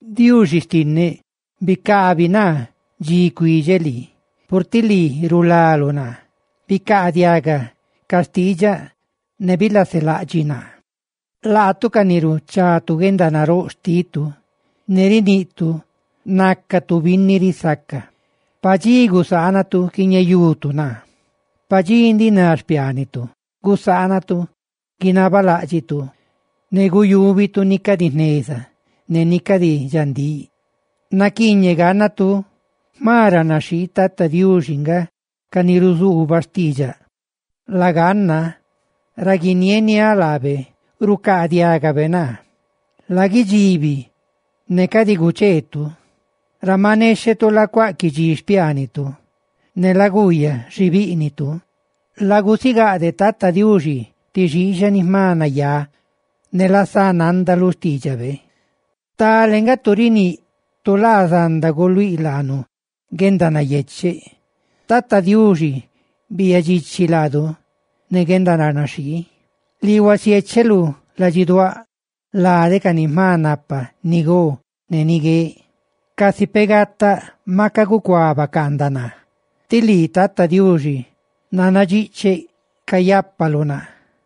Diuxi xtinneꞌ, ¡bicabi naa dxi cuidxeꞌ lii!, purtiꞌ lii, rulaluꞌ naa, ¡bicaadiaga ca xtiidxaꞌ ne bilaselaꞌdxiꞌ naa! Laatu ca ni ruchatu guendanaróꞌ xtitu ne riniꞌtu nacatu binni risaca, pa dxi gusaanatu quiñeyutu naa, pa dxi ndiꞌ ná xpiaanitu gusaanatu guinabaláꞌdxituꞌ, ne guyúbitu ni cadi jneza ne ni cadi dxandíꞌ. Naquiiñeꞌ gannatu jma ranaxhii tata Diuxi nga ca ni ruzuuba xtiidxaꞌ; laganna ra guinieniáꞌ laabe rucaadiagabe naa. ¡Laguidxibi ne cadi gucheerutu! Ra maꞌ nexhetu lacuaquidxiꞌ xpiaanitu, ne laguuyaꞌ xi bíꞌnitu; Lagusigaꞌdeꞌ tata Diuxi ti xixaꞌ ni jma nayá, ne lasá nanda lu xtiidxabe. Stale nga tu riníꞌ: «Tu laa zanda guluíꞌ laanu guendanayecheꞌ.» ¡Tata Diuxi, biiyaꞌ dxichi laadu ne guendaranaxhii! Lii huasiécheluꞌ ladxiduáꞌ lade ca ni jma napa ni go ne ni gueꞌ. Casi peꞌ gataꞌ maca gucuá bacaandaꞌ naa, tí lii Tata Diuxi nannadxicheꞌ cayápaluꞌ naa.